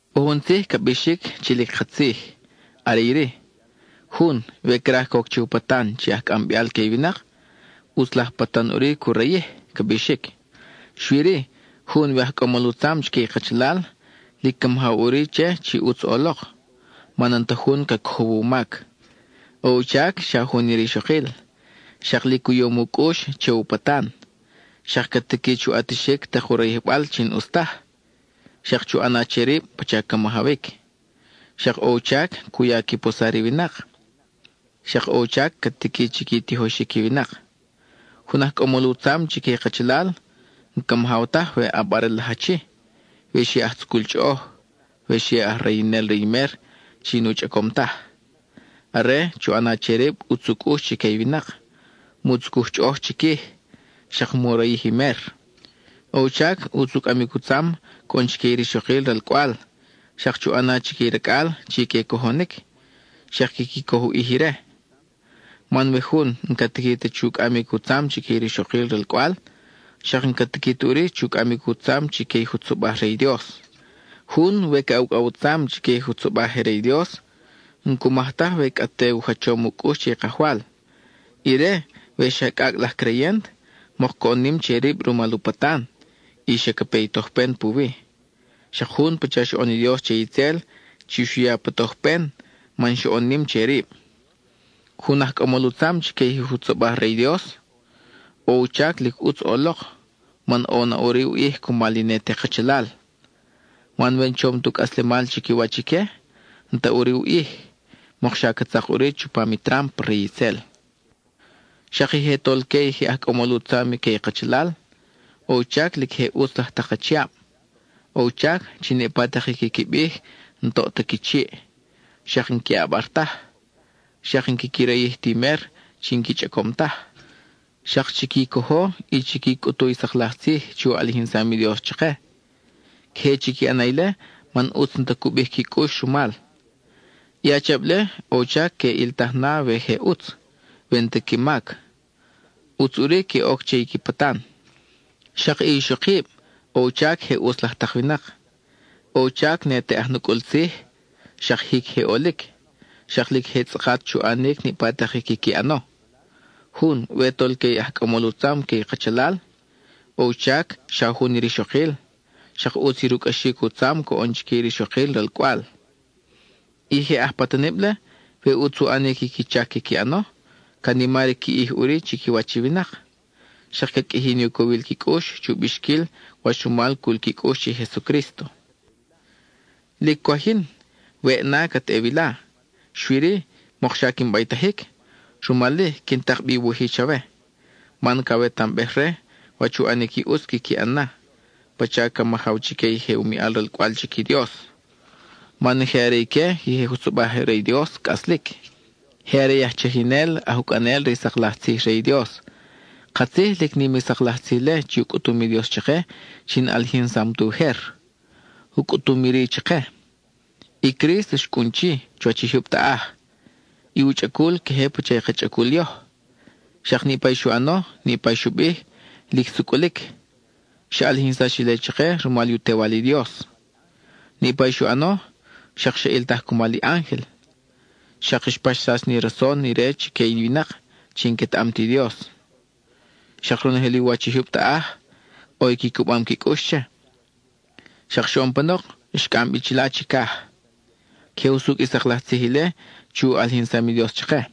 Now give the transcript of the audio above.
ʼO jun tzij ca bixic chi lic katzij; are iri: “Jun, we craj coc che u patan chi aj cʼambeal que i winak, ʼutz laj patan ʼuri cu rayij,” ca bixic. Xui-ri, jun we aj cʼamol u tzam chique i kachalal, lic ca majaw ʼuri che chi ʼutz ʼolok, man n-ta jun ca cojow u mac. ʼO u chac xa jun i rixokil, xak lic u yom u cʼux che u patan, xak ca tiqui chu ʼatixic tak u rayijbal chi n-ʼus taj; xak chu ʼana che rib pacha ca majawic. Xak ʼo u chac cu ya qui posar i winak, xak ʼo u chac ca tiqui chi qui tijoxic i winak. Jun aj cʼamol u tzam chique i kachalal, n-ca majaw taj we ʼabarel laj achi, we xi aj tzucul chʼoʼoj, we xi aj rayinel re i mer chi nu chʼacom taj. Are, chu ʼana che rib ʼutz u cʼux chique i winak, mu tzucuj chʼoʼoj chiquij, xak mu rayij i mer. ʼO u chac ʼutz u cʼamic u tzam coʼon chique i rixokil ralcʼwal, xak chu ʼana chique i racʼal chi que cojonic, xak quiqui coj u ʼij ire. Man we jun n-ca tiqui ta chu cʼamic u tzam chique i rixokil ralcʼwal, xak n-ca tiqui ta ʼuri chu cʼamic u tzam chique i jutzobaj re i Dios. Jun we ca ucʼaw u tzam chique i jutzobaj je re i Dios, n-cu maj taj we cʼa te u jachom u cʼux che i Kajwal. Ire, we xa cʼacʼ laj creyent, mok coʼon nim che rib rumal u patan, y xa ca pe i tojpen puwi, xak jun pacha xoʼon i Dios che itzel chi xu ya pa tojpen man xoʼon nim che rib. Jun aj cʼamol u tzam chique i jutzobaj re i Dios, ʼo u chac lic ʼutz ʼolok, man ʼo na ʼuri u ʼij cumal i ne te kachalal. Man we n-chom tu cʼaslemal chiquiwach ique, n-ta ʼuri u ʼij; mokxa ca tzak ʼuri chupam i trámpa re itzel. Xak i je tolque i je aj cʼamol u tzam que i kachalal, ʼo u chac lic je ʼutz laj tak achiab; ʼo u chac chi niʼpa tak i quiqui bij n-toʼ ta qui chiʼ; xak n-que ʼabar taj, xak n-quiqui rayij ti mer chi n-qui chʼacom taj. Xak chiqui cojo, chiqui cʼutu i sak laj tzij chi u ʼalijinsam i Dios chake. Queje chiqui ʼana ile man ʼutz n-ta cu bij qui cʼux rumal. I achiab-le, ʼo u chac que ʼiltaj na we je ʼutz; we n-ta qui mac, ʼutz ʼuri que oc che i qui patan. Xak i ixokib, ʼo u chac je ʼutz laj tak winak. ʼO u chac ne te aj nucʼul tzij, xak jic je ʼolic, xak lic je tzʼakat chu ʼanic niʼpa tak i quiqui ʼano. Jun, we tolque i aj cʼamol u tzam que i kachalal, ʼo u chac xa jun i rixokil, xak ʼutz i rucʼaxic u tzam coʼon chique i rixokil ralcʼwal. I je aj patanible, we ʼutz u ʼanic i qui chac quiqui ʼano, ca nimar i qui ʼij ʼuri chiquiwach i winak, xak ca qʼuiji ni u cowil qui cʼux chu bixquil wach rumal cul qui cʼux che i Jesucrísto. Lic cwaj yin, weʼ na cat ʼe wila; xui-ri, mokxa quin baytajic, rumal-i quin tak bi i wuj-i chawe, man cawetambej re wach u ʼanic i ʼutz quiqui ʼan na, pacha ca majaw chique i je u miʼal ralcʼwal chic i Dios. Man je are ique i je jutzobaj re i Dios cʼaslic; je are i aj chajinel, aj ucʼanel re i sak laj tzij re i Dios. Katzij, lic nim i sak laj tzij-le chi u cʼutum i Dios chake chi n-ʼalijinsam ta ujer. U cʼutum iri chake: I Crísto xcʼun chi, chuwach i jyub taʼaj, i u chʼacul queje pacha i ka chʼacul yoj, xak niʼpa i xu ʼano, niʼpa i xu bij, lic sucʼulic; xa ʼalijinsax ile chake rumal u Tewal i Dios. Niʼpa i xu ʼano, xak xa ʼiltaj cumal i ángel. Xak xpaxsax ni rason ire chique i winak chi n-quetaʼam ti Dios. Xak ronojel i u wach i jyub taʼaj, ʼo i qui cubam qui cʼux che. Xak xoʼon panok, xcʼam bi chila chicaj. Queje usucʼ i sak laj tzij ile chi u ʼalijinsam i Dios chake.